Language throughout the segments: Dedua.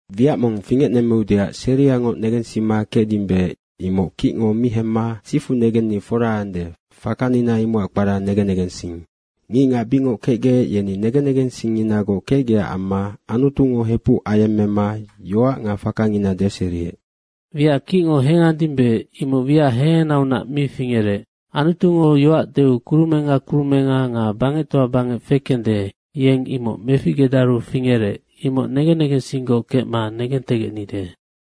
Wiac mong fingecnemmeudeac seriangoc negensima kecdimbe, imoc kicngo mi hemma sifu negenni fora ande, fakanina imocac kpara negen negensing. Ngicngac bicngoc kecgec yeni negen negensingnginagoc kecgecac amma Anutungo hepuc ayemmema yoac nga fakangina deseriec. Wiac kicngo hengandimbe, imoc wiac hehenaunac mi fingerec. Anutungo yoac deu kurumenga kurumenga nga bangectoa bangec fekende, yeng imoc meficgedaru fingerec, imoc negen negensinggoc kecma negentegecnide.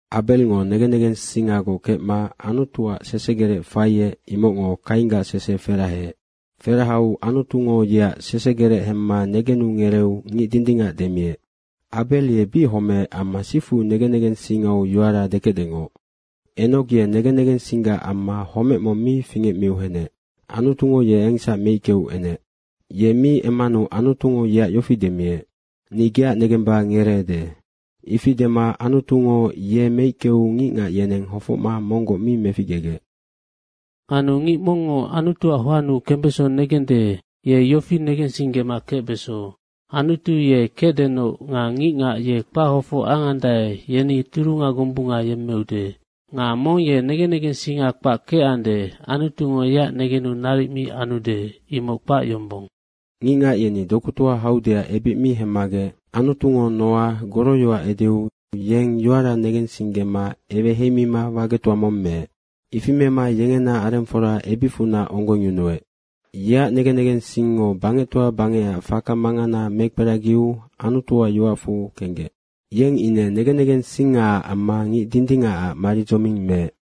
Abengo negen negensingagoc kecma Anutuac sesegerec faiec, imocngo Kainggac sese feraheec. Ferahau Anutungo yeac sesegerec hemma negenu ngereeu ngic dindingac demiec. Abe ye bic homeec, amma sifu negen negensingau yoara dekecdengoc. Enoko ye negen negensinggac amma homec mong mi fingecmiu henec. Nga Anutungo ye engsac meickeu enec. Ye mi emmanu Anutungo yeac yofi demiec, “Ni geac negemba ngereede.” Ifi dema Anutungo ye meickeu ngicngac yeneng hofocma monggoc mi meficgegec. Anu ngic mongngo Anutuac hoannu kembeso negende, ye yofi negensinggema kecbeso, Anutu ye kecdenoc nga ngicngac ye kpachofoc angandae, yeni turunga gombunga yemmeude. Nga mong ye negen negensinga kpac kecande, Anutungo yeac negenu naric mi anude, imoc kpac yombong. Ngicngac yeni dokutoa haudeac ebic mi hemmagec Anutungo Noa goroyoac edeu yeng yoara negensinggema eweheimima wagetoa mong meec. Ifi mema yengena arengfora ebicfunac onggongyunuec. Yeac negen negensingngo bangectoa bangecac faka mangana mekperagiu Anutuac yoacfu kenggec. Yeng ine negen negensingaac amma ngic dindingacac maridzoming meec.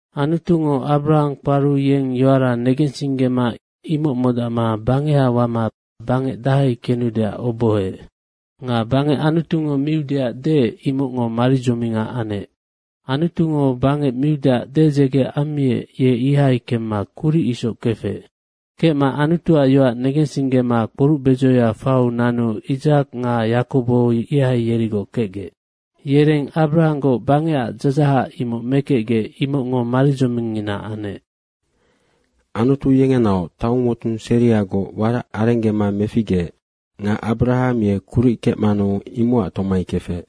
Anutungo Abrahang kparu yeng yoara negensinggema imoc modacma bangeha wama bangec dahai kenudeac obohoec. Nga bangec Anutungo miudeac deec, imocngo maridzominga anec. Anutungo bangec miudeac dedzege ammiec, ye ihai kemma kuric isoc kefec. Kecma Anutuac yoac negensinggema kporucbedzoya faiu nanu Isaka nga Yakobo ihai yerigoc kecgec. Yereng Abrahanggoc bangecac dzadzahac imoc mekecgec imocngo maridzomingngina anec. Anutu yengenaoc taong wotungseriagoc warac arenggema meficgeec nga Abarahang ye kuric kecmanu imocac tomai kefec.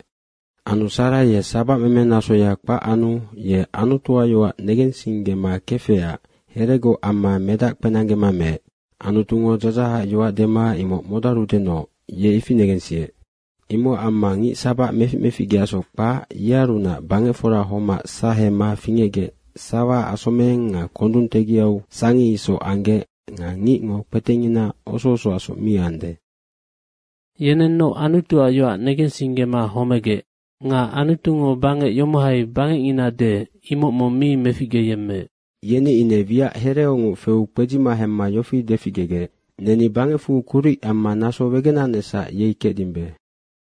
Anu Sara ye sabacmeme nasoya kpac anec. Nga ye Anutuac yoac negensinggema kefecac heregoc amma medac kpenanggema meec. Anutungo dzadzahac yoac dema imoc modarudenoc, ye ifi negensiec. Imocac amma ngic sabac meficmeficgeacsoc kpac, yearunac bangecfora homac sahema fingecgec sawaac asomeng nga kondung tegiau sangi isoc anggec nga ngicngo kpetengina oso osoacsoc mi ande. Yenennoc Anutuac yoac negensinggema homegec. Nga Anutungo bangec yomohai bangecngina deec, imoc mong mi meficgeyemmeec. Yeni ine wiac hereaungoc feu kpedzima hemma yofi deficgegec, “Neni bangecfu kuric amma naso wegenanecsac yei kecdimbe.”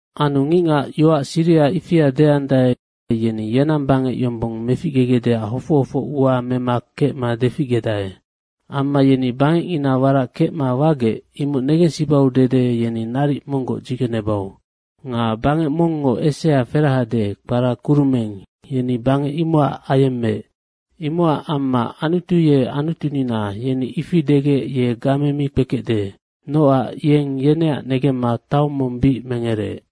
Anu ngicngac yoac siriha ifia deandae, yeni yenang bangec yombong meficgegecdeac hofoc hofoc ua mema kecma deficgedae. Amma yeni bangecngina warac kecma wagec, imoc negensibau dede yeni naric monggoc dzigenebau. Nga bangec mongngo esea ferahede kpara kurumeng, yeni bangec imocac ayemmeec. Imocac amma “Anutu ye Anutunina.” yeni ifi degec, ye game mi kpekecde, nocac yeng yeneac negemma taong mong bic mengereec.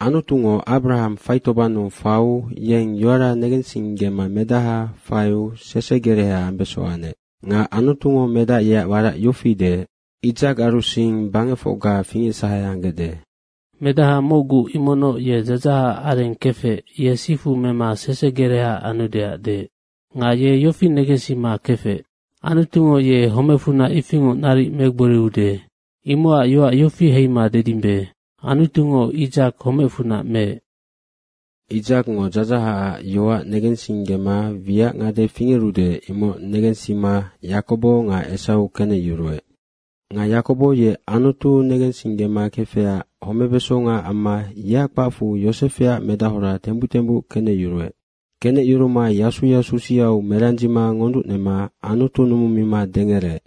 Anutungo Abrahang faitobannu faiu, yeng yoara negensinggema medaha faiu sesegereha ambeso anec. Nga Anutungo medac yeac warac yofi deec, “Isakaarusing bangecfocga fingecsahe anggecde.” Medaha mocgu imocnoc ye dzadzahacac areng kefec ye sifu mema sesegereha anudeac deec. Nga ye yofi negensima kefec, “Anutungo ye homecfunac ifingoc naric megboriude.” Imocac yoac yofi heima dedimbe, “Anutungo Isaka homecfunac meec.” Isakango dzadzahacac yoac negensinggema wiac ngade fingerude, imoc negensima Yakobo nga Esau kenecyuruec. Nga Yakobo ye Anutu negensinggema kefecac homebesonga amma yeac kpacfu Yosefeac medachora tembuc tembuc kenecyuruec. Kenecyuruma yasuya susiau merandzima ngonducnema Anutu numumima dengereec.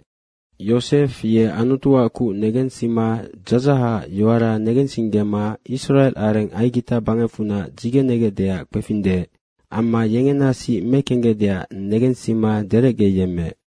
Yosefe ye Anutuac kuc negensima dzadzahac yoara negensinggema Israe areng Aigita bangecfunac dzigenegecdeac kpefing deec. Amma yengena sic mekenggecdeac negensima derecgeyemmeec.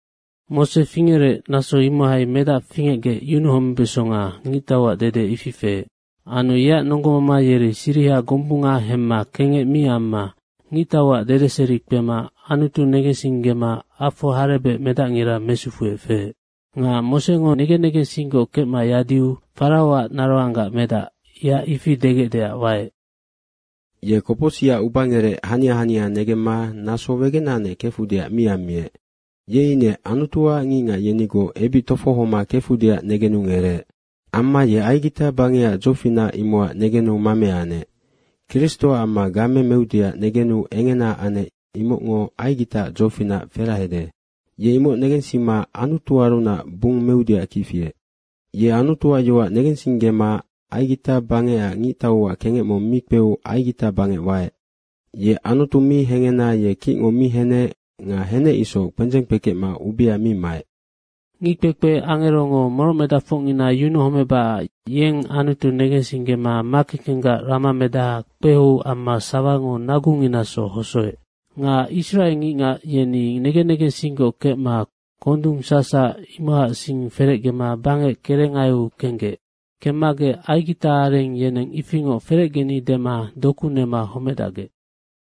Mose fingerec, naso imohai medac fingecgec yunuhomebesonga, ngictauac dede ifi feec. Anu yeac nonggomama yeri siriha gombunga hemma kengec mi amma ngictauac dedeseri kpema Anutu negensinggema afo harebec medacngira mesufuec feec. Nga Mosengo negen negensinggoc kecma yadiu Faraoac naroanggac medac, yeac ifi degecdeac waec. Ye kopocsicac ubangerec hania hania negemma naso wegenanec kefudeac mi ammiec. Ye ine Anutuac ngicngac yenigoc ebic tofohoma kefudeac negenu ngereec. Amma ye Aigita bangecac dzofinac imocac negenu mamea anec. Kristoac amma game meudeac negenu engena anec, imocngo Aigitaac dzofinac ferahede. Ye imoc negensima Anutuarunac bung meudeac kic fiec. Ye Anutuac yoac negensinggema Aigita bangecac ngictauac kengec mong mi kpeu Aigita bangec waec. Ye Anutu mi hengena, ye kicngo mi henec nga henec isoc kpendzeng kpekecma ubea mi maec. Ngic kpekpe angerongo morocmedacfocngina yunuhomebacac yeng Anutu negensinggema makekenggac ramamedaha kpehou amma sawango nagunginasoc hosoec. Nga Israe ngicngac yeni negen negensinggoc kecma kondung sacsac imohacsing ferecgema bangec kerengaiu kenggec. Kemmagec Aigita areng yeneng ifingoc ferecgeni dema doku nema homedacgec.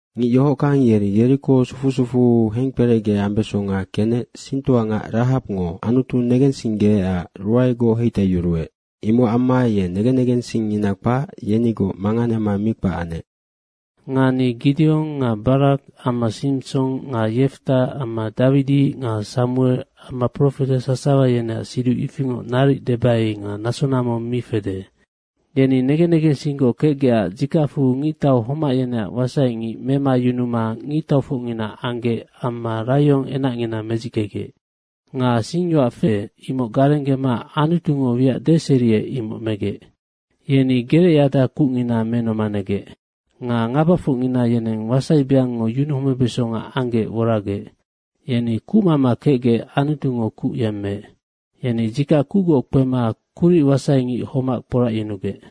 Ngic yohockang yeri Yeriko sufu sufuu hengkperecge ambesonga kenec singtoangac Rahabango Anutu negensinggeecac ruaegoc heitaiyuruec. Imocac amma ye negen negensingngina kpac yenigoc manganema mi kpac anec. Nga ni Gideong nga Baraki amma Simsong nga Yefita amma Dawidi nga Samue amma profete sasawa, yeneac siduc ifingoc naric debai nga nasona mong mi fede. Yeni negen negensinggoc kecgecac dzikacfu ngictau homac yeneac wasaingic memayunuma ngictaufocngina anggec amma raiong enacngina medzickegec. Nga singyoac feec imoc garenggema Anutungo wiac deseriec imoc megec. Yeni gerecyada kucngina menomanegec. Nga ngabafocngina yeneng wasaibeangngo yunuhomebeso anggec woragec. Yeni kucmama kecgec Anutungo kuc yemmeec. Yeni dzikac kucgoc kpema kuric wasaingic homac kporacyunugec.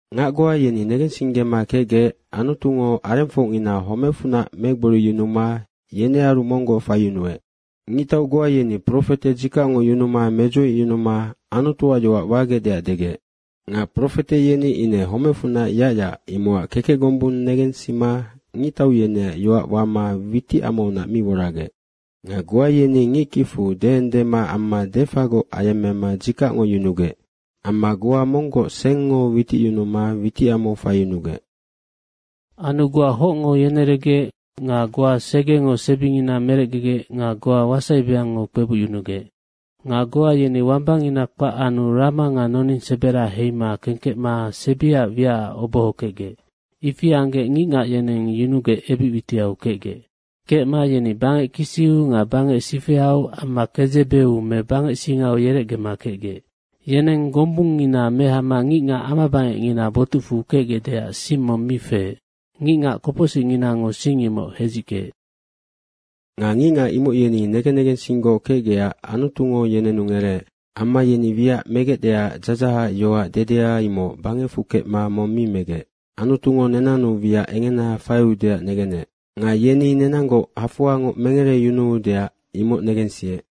Ngac goa yeni negensinggema kecgec Anutungo arengfocngina homecfunac megboriyunuma yenearu monggoc faiyunuec. Ngictau goa yeni profete dzikacngo yunuma medzoicyunuma Anutuac yoac wagecdeac degec. Nga profete yeni ine homecfunac yacyac, imocac kekec gombung negensima ngictau yeneac yoac wama witicamaunac mi woragec. Nga goa yeni ngickicfu deendema amma defagoc ayemmema dzikacngo yunugec. Amma goa monggoc sengngo witicyunuma witicamau faiyunugec. Anu goa hocngo yeneregec nga goa segengo sebingina merecgegec nga goa wasai beangngo kpebucyunugec. Nga goa yeni wambangina kpac anu rama nga noning sebera heima kengkecma sebiac wiacac obohokecgec. Ifi anggec ngicngac yeneng yunugec ebic witiau kecgec. Kecma yeni bangec kisiu nga bangec sifehau amma kedzebeu me bangec singau yerecgema kecgec. Yeneng gombungngina mehama ngicngac amabangecngina botucfu kecgecdeac sing mong mi feec. Ngicngac kopocsicnginango sing imoc hedzickeec. Nga ngicngac imoc yeni negen negensinggoc kecgecac Anutungo yenenu ngereec. Amma yeni wiac megecdeac dzadzahac yoac dedea, imoc bangecfu kecma mong mi megec. Anutungo nenannu wiac engena faiudeac negenec. Nga yeni nenanggoc hafoangoc mengereyunuudeac imoc negensiec.